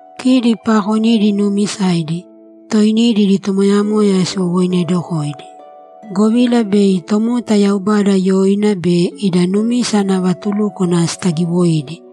Kidi paakonidi nuumisaidi, toinidi idi tomoyamoya siwowoinedokōidi, govila bei tomota Yaubada yoina be ida numisa ana vatulúkwana sitagiwoidi.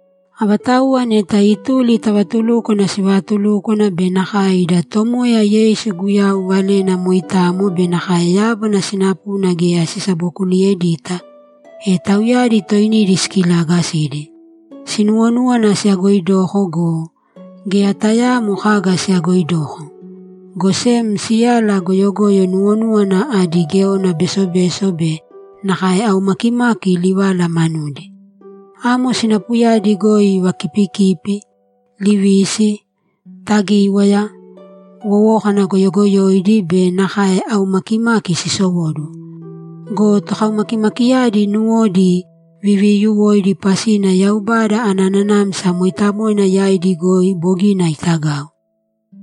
Avatauwa neta ituli ta vatulúkwana sivaatulúkwana be nakae ida Tomoya Yeisu Guyau valena moitamo be nakae yábana sinapuna geya sisabokuliyedita, e tauyadi toinidi sikilaagasidi. Sinuwonúwana siyagoidoko go, geya tayaamo kaga siyagoidoko, go sem siyala goyogoyo nuwonúwana adi géona besobeso be nakae aumakimaki livala manudi. Amo sinapuyadi goi vakipikipi, livisi, tagíwaya, wowókana goyogoyoidi be nakae aumakimaki sisowóduwo. Go tokaumakimakiyadi nuwodi viviyuwoidi pasina Yaubada ana Nanamsa Mooitamoina yaidi goi bogina itagau.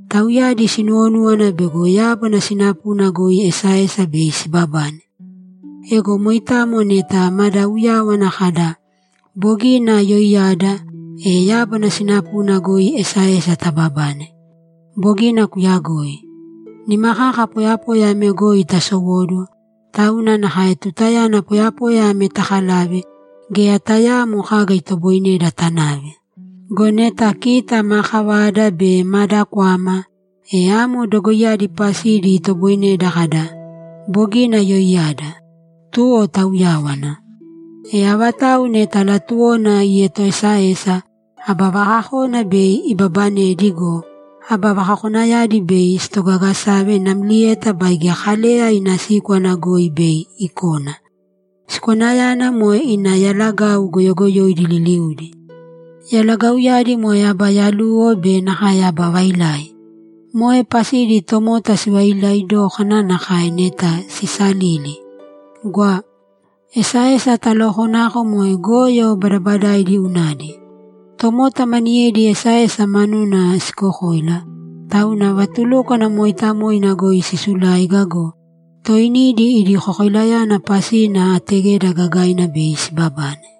Tauyadi sinuwonúwana bego yábana sinapuna goi esaesa bei sibabane. Ego moitamo neta mada uyáwana kada, ‘Bogina yoiyada’, e yábana sinapuna goi esaesa tababane. Bogina kuyagoi. Nima kaka poyapoya ame goi tasowóduwo, tauna nakae tutayana poyapoya ame takalave, geya tayaamo kaga itoboineda tanave. Go neta kita ma kavada be mada kwama, e amo dogoiyadi pasidi itoboineda kada, ‘Bogina yoiyada.’ Tuwo tauyáwana. E avatau neta latuwona ietoesaesa, aba vakakona bei ibabanedi go, aba vakakonayadi bei sitogagasave namlieta baige Kaleya ina síkwana goi bei ikona. Sikwanayana moe ina yalagau goyogoyoidi liliudi. Yalagauyadi moe aba yaluwo be nakae aba vailai. Moe pasidi tomota sivailai dókana nakae neta sisalili! Gwa. Esaesa talookonako moe goyo badabadaidi unadi. Tomota maniyedi esaesa manuna sikokoila, tauna vatulúkwana mooitamoina goi sisuláiga go, toinidi idi kokoilayana pasina ategeda gagaina bei sibabane.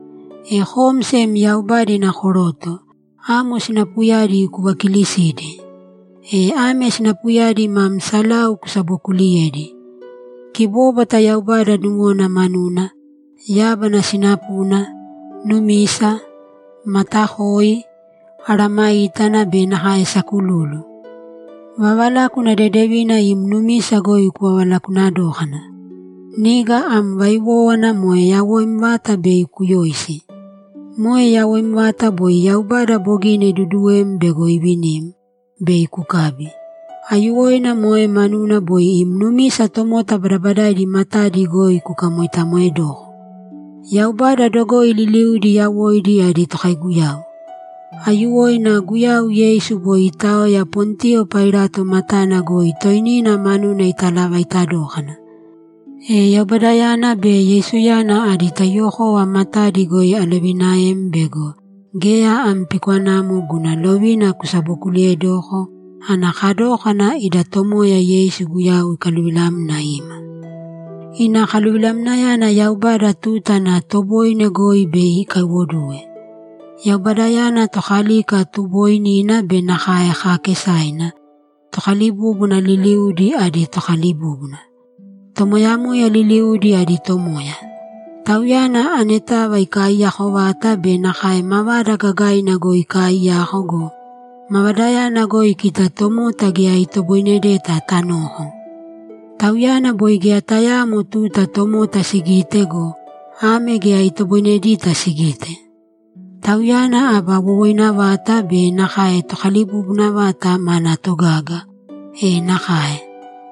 E kom sem Yaubada ina Koroto, amo sinapuyadi kuvakiilisīdi. E ame sinapuyadi mam salau kusabokuuliyēdi: Kibóbwata Yaubada nuwona manuna, yábana sinapuna, numisa, matakoi, mesayágana be nakae sakululu. Vavalákuna dedevina im numisa goi kuvavalakuuna dōkana. Niga am vaiwówana moe yawoim vata bei kuyoisi. Moe yawoim vata boi Yaubada bogina iduduwem bego ivinim, bei kukabi. Aiyuwoina moe manuna boi im numisa tomota badabadaidi matadi goi kukamoitamoedōko. Yaubada dogoi liliudi yawoidi adi tokaiguyau. Aiyuwoina Guyau Yeisu boi iitaoya Pontiyo Pailato matana goi toinina manuna italavaita dókana. E Yaubadayana be Yeisuyana adi taiyuwokova matadi goi alovinaem bego geya am pikwanamo guna lovina kusabokuliiyedōko ana kadókana ida Tomoya Yeisu Guyau ikaluvilamna ima. Ina kaluvilamnayana Yaubada tuta ana toboine goi bei ikaiwoduwe. Yaubadayana Tokalika tubooinina be nakae kaakesaina, tokalibúbuna liliudi adi Tokalibúbuna, tomoyamoya liliudi adi Tomoya. Tauyana anetava ikaiyako vata be nakae mavada gagaina goi ikaaiyaka go, mavadayana goi kita tomota geya itoboinedeta tanoko. Tauyana boi geya tayaamo tuta tomota sigite go, ame geya itoboinedita sigite. Tauyana aba wowoina vata be nakae Tokalibubuna vata mana togaga. E nakae!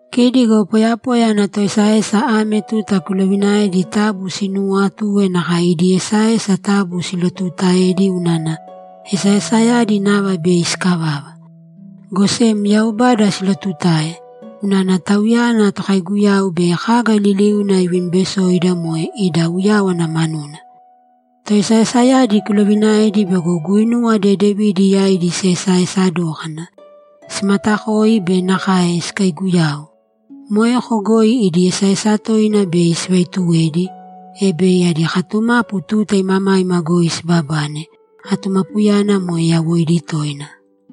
Kidi go poyapoya ana toesaesa ame tuta kuloviinaēdi taabu sinuuwatūe nakae idi esaesa taabu silotuutaēdi unana esaesayadi nava bei sikavava. Go sem Yaubada silootutāe, unana Tauyana tokaiguyau bei kaga liliuna ivinibesoida moe ida uyáwana manuna. Toesaesayadi kuloviinaēdi bego guinuwa dedevidi yaidi siesaesa dōkana, simaatakōi be nakae sikaiiguyāu. Moeko goi idi esaesa toina bei sivaituwedi, e bei adi katumapu tuta imamaima goi sibabane; atumapuyana moe yawoidi toina.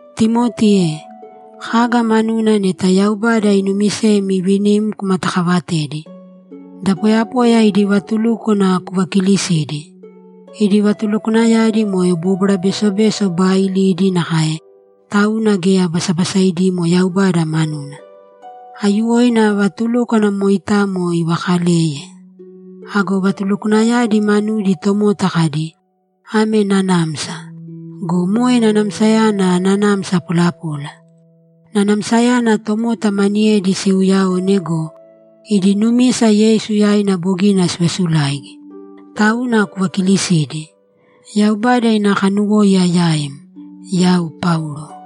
Timoti e, kaga manuna neta Yaubada inumisem iivinim kumatakaavatēdi. Da poyapoya idi vatulúkwana kuvakiilisīdi. Idi vatulukwanayadi moe bóbwara besobeso baailidi nakae, tauna geya basabasaidimo Yaubada manuna. Aiyuwoina vatulúkwana moitamo ivaakaleye. Ago vatulukwanayadi manudi tomota kadi, ‘Ame nanamsa.’ Go moe nanamsayana nanamsa polapola. Nanamsayana tomota maniyedi siuuyaone go, idi numisa Yeisu yaina bogina sivasulaigi, tauna kuvakilisīdi. Yaubada ina kanuwóiya yaim. Yau Paulo